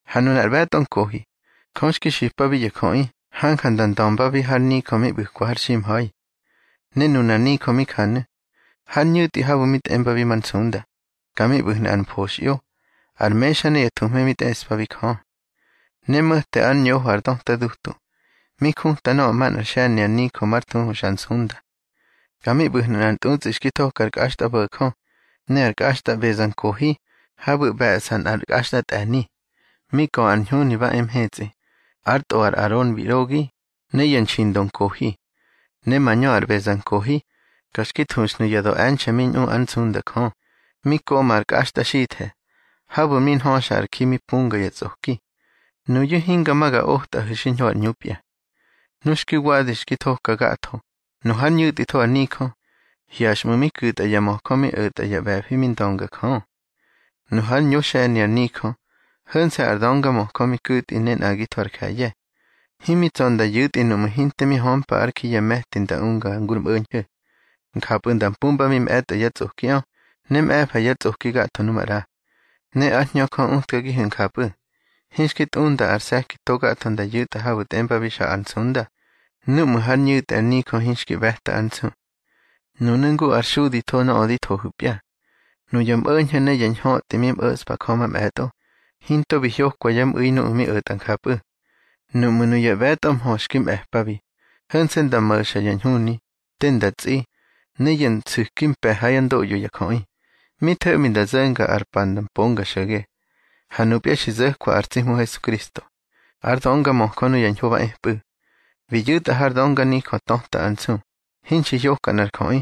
Ha nunar ꞌbe̱tꞌo nkohi, Jö xki xipabi ya jöꞌi hanja nda ndömbabi har nijö mi ꞌbu̱kwa har ximha̱i. Ne nunar nijö mi njanu̱: Har ñu̱tꞌi habu̱ mi tꞌembabi Mar Nsunda, ka mi ꞌbu̱hnu̱ ar mfoxꞌyo, ar mexa ne ya thuhme mi tꞌeꞌspabi Jö. Ne mo̱te ár ñoho ar döta dutu, mi juta nöꞌö manꞌár xe̱ni ar nijö mar thuhu Xa Ar Nsunda. Ka mi ꞌbu̱hnu̱ nꞌar ntꞌutsꞌi xki thoka ar kꞌaxtꞌabo̱jö, ne ar kꞌaxtꞌa ꞌbezankohi habu̱ ꞌbe̱ꞌsa nꞌar kꞌaxtꞌatꞌe̱ni, mi kö ar ñhuni ba e mhetsꞌi, ár tꞌo ar Aron bi ꞌrogi, ne ya nxindo nkohi. Ne mañö ar ꞌbezankohi, ka xki thuxnu̱ ya döꞌe̱nxe̱ mi ñꞌu ár nsunda Jö, mi koꞌma ar kꞌaxtꞌaxithe̱, habu̱ mi nhöxa ar ji mi punga ya tsꞌoki. Nuyu̱ hinga ma ga otꞌahu̱ xiñho ar ꞌñupya. Nu xki wadi xki thoka gatho, nu hár ñu̱tꞌitho ar nijö, hyaxꞌmu̱ mi ku̱tꞌa ya möjö mi o̱tꞌa yá ꞌbe̱fi mi ndöngajö. Nu hár ñoxe̱ni ar nijö, ho̱nse̱ ar döngamöjö mi ku̱tꞌi ne nꞌagitho ar je̱ye̱. Himi tsa̱ nda yu̱tꞌi nuꞌmu̱ hinte mi hömpa ár ji ya me̱ti nda unga ngu ar mꞌo̱ñho̱. Njapꞌu̱ nda mpumbabi mꞌe̱tꞌo yá tsꞌokiꞌö, ne mꞌe̱fa yá tsꞌoki gatho nu maꞌra. Ne ár Hñö Jö utkagihu̱ njapꞌu̱, hinxki tꞌunda ar se̱ki to gatho nda yu̱tꞌa habu̱ tꞌembabi Xa Ar Nsunda, núꞌmu̱ hár ñu̱tꞌi ar nijö hinxki ꞌbe̱ta ár nsu. Nunu̱ ngu ár xuditho nöꞌö di thohu̱pya. Nuya mꞌo̱ñho̱ ne ya ñhötꞌi mi mꞌo̱ꞌspa Jö mamꞌe̱tꞌo, hinto bi hyokwa yá mꞌu̱i nuꞌu̱ mi o̱tꞌa njapꞌu̱. Nuꞌmu̱ nuya ꞌbe̱tꞌo mhö xki mꞌe̱pabi, ho̱nse̱ nda mo̱xa ya ñhuni, te nda tsꞌi, ne ya nsu̱ki mpe̱ hár ndoꞌyo ya jöꞌi, mi tho̱ꞌmi nda zo̱nga ar pa nda mponga xo̱ge. Ha nupya xi zo̱kwa ar tsi Hmu Hesukristo, ár döngamöjö nuya ñho ba epꞌu̱. Bi yu̱tꞌa har dönga nijö töta ár nsu, hinxi hyoka nꞌar jöꞌi,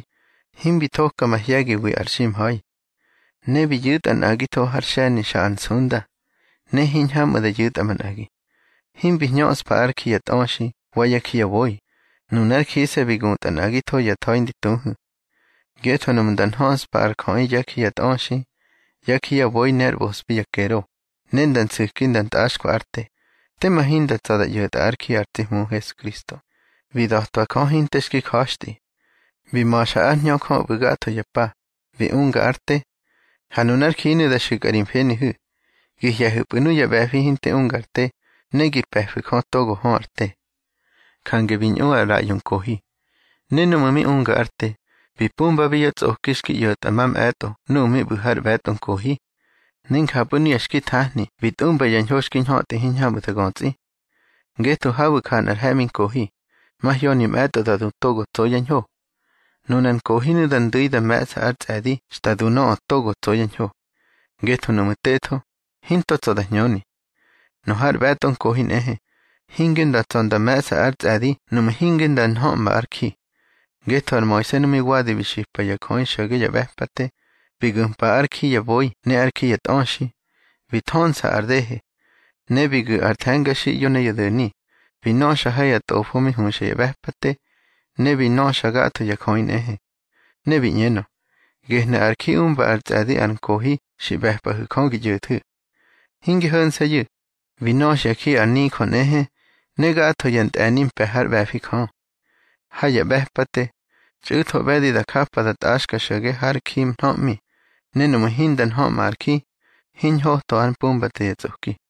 himbi thoka mahye̱giwi ar ximha̱i. Ne bi yu̱tꞌa nꞌagitho har xe̱ni Xa Ar Nsunda, ne hiñhamꞌu̱ da yu̱tꞌa manꞌagi. Himbi hñöꞌspa ár ji ya tꞌöxi wa yá ji ya boi, nunár jise̱ bi gutꞌa nꞌagitho ya tha̱i ndi tuhu̱. Ngetho nuꞌmu̱ nda nhöꞌspa ar jöꞌi yá ji ya tꞌöxi, yá ji ya boi ne ár ꞌbospi ya kero, ne nda nsu̱ki nda ntꞌaxka ár te, tema hinda tsa̱ da ꞌyo̱tꞌa ár ji ar tsi Hmu Hesukristo, bi da̱twa Jö hinte xki ja̱xtꞌi. Bi ma̱xa ár Hñö Jö ꞌbu̱ gatho ya pa, bi unga ár te. Ha nunár jinu̱ da xu̱kꞌa ri mfenihu̱, gi hye̱hu̱pꞌu̱ nuya ꞌbe̱fi hinte unga ar te, ne gi pe̱fu̱ Jö togo hö ar te. Jange bi ꞌñu ar ꞌraꞌyo nkohi. Ne núꞌmu̱ mi unga ár te, bi mpumbabi yá tsꞌoki xki ꞌyo̱tꞌa mamꞌe̱tꞌo nuꞌu̱ mi ꞌbu̱ har ꞌbe̱tꞌo nkohi. Ne njapꞌu̱ nuya xki thahni bi tꞌumba ya ñho xki ñhötꞌi hiñhamꞌu̱ da götsꞌi. Ngetho habu̱ ja nꞌar he̱ꞌmi nkohi, mahyoni mꞌe̱tꞌo da du togo tso yá ñho. Nunar nkohinu̱ da ndu̱i da me̱ꞌsa ár tsꞌe̱di xta du nöꞌö togo tso yá ñho. Ngetho nuꞌmu̱ tetho, hinto tsa̱ da hñöni. Nu har ꞌbe̱tꞌo nkohi nꞌehe, hinge nda tsa̱ nda me̱ꞌsa ár tsꞌe̱di nuꞌmu̱ hinge nda nhöꞌma ar ji. Ngetho ar Moise nu mi wadi bi xipa ya jöꞌi xo̱ge ya ꞌbe̱pate, bi gu̱mpa ár ji ya boi ne ár ji ya tꞌöxi, bi thönsa ar dehe. Ne bi gu̱ ar the̱ngaxiꞌyo ne ya do̱ni, bi nöxa ha ya tꞌofo mi huxa ya ꞌbe̱pate, ne bi nöxa gatho ya jöꞌi nꞌehe. Ne bi ꞌñenö: Gehnu̱ ar ji umba ár tsꞌe̱di ar nkohi xi ꞌbe̱pꞌahu̱ Jö gi ꞌyo̱thu̱. Hinge ho̱nse̱yu̱, bi nöxya ji ar nijö nꞌehe, ne gatho ya ntꞌe̱ni mpe̱ hár ꞌbe̱fi Jö. Ha ya ꞌbe̱pate, txꞌu̱tho ꞌbe̱di da japa da tꞌaxka xo̱ge har ji nhöꞌmi, ne nuꞌmu̱ hinda nhöꞌma ar ji, hiñꞌotho ár mpumbate ya tsꞌoki.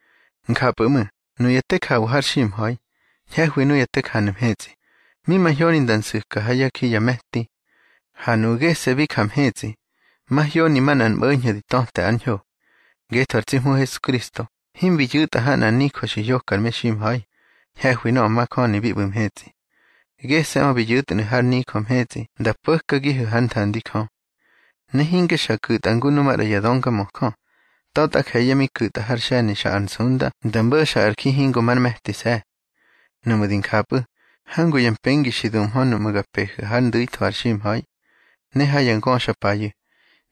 Njapꞌu̱ ꞌmu̱ nuya te jawa har ximha̱i, ñhe̱hwi nuya te janu̱ mhetsꞌi, mi mahyoni nda nsu̱ka ha yá ji ya me̱ti. Ha nuꞌu̱ gese̱ bi ja mhetsꞌi, mahyoni manꞌar mꞌo̱ñho̱ di töte ár ñho. Ngetho ar tsi Hmu Hesukristo himbi yu̱tꞌa ha nꞌar nijö xi hyoka ar meximha̱i, ñhe̱hwi nöꞌö majöni bi ꞌbu̱ mhetsꞌi. Gese̱ꞌö bi yu̱tnu̱ har nijö mhetsꞌi nda po̱kagihu̱ hár nthandi Jö. Ne hinge xa ku̱tꞌa ngu nu maꞌra ya döngamöjö, ta̱tꞌa je̱ye̱ mi ku̱tꞌa har xe̱ni Xa Ar Nsunda nda mo̱xa ar ji hingo már me̱tise̱. Nuꞌmu̱ di njapꞌu̱, hangu ya mpengi xi dumhö nuꞌmu̱ ga pehu̱ hár ndu̱itho ar ximha̱i. Ne ha ya ngöxapayu̱,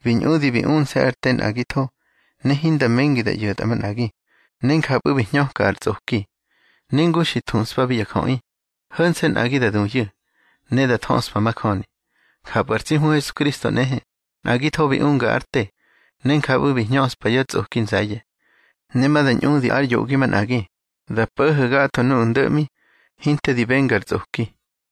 bi ñꞌudi bi unse̱ ár te nꞌagitho, ne hinda mengi da ꞌyo̱tꞌa manꞌagi, ne njapꞌu̱ bi hñöka ar tsꞌoki. Ne ngu xi thuꞌspabi ya jöꞌi, ho̱nse̱ nꞌagi da duyu̱, ne da thöꞌspa majöni, njapꞌu̱ ar tsi Hmu Hesukristo nꞌehe, nꞌagitho bi unga ár te, ne njapꞌu̱ bi hñöꞌspa yá tsꞌoki nze̱ye̱. Ne ma da ñꞌudi ár yoꞌgi manꞌagi, da po̱ho̱ gatho nuꞌu̱ ndo̱ꞌmi, hinte di benga ar tsꞌoki.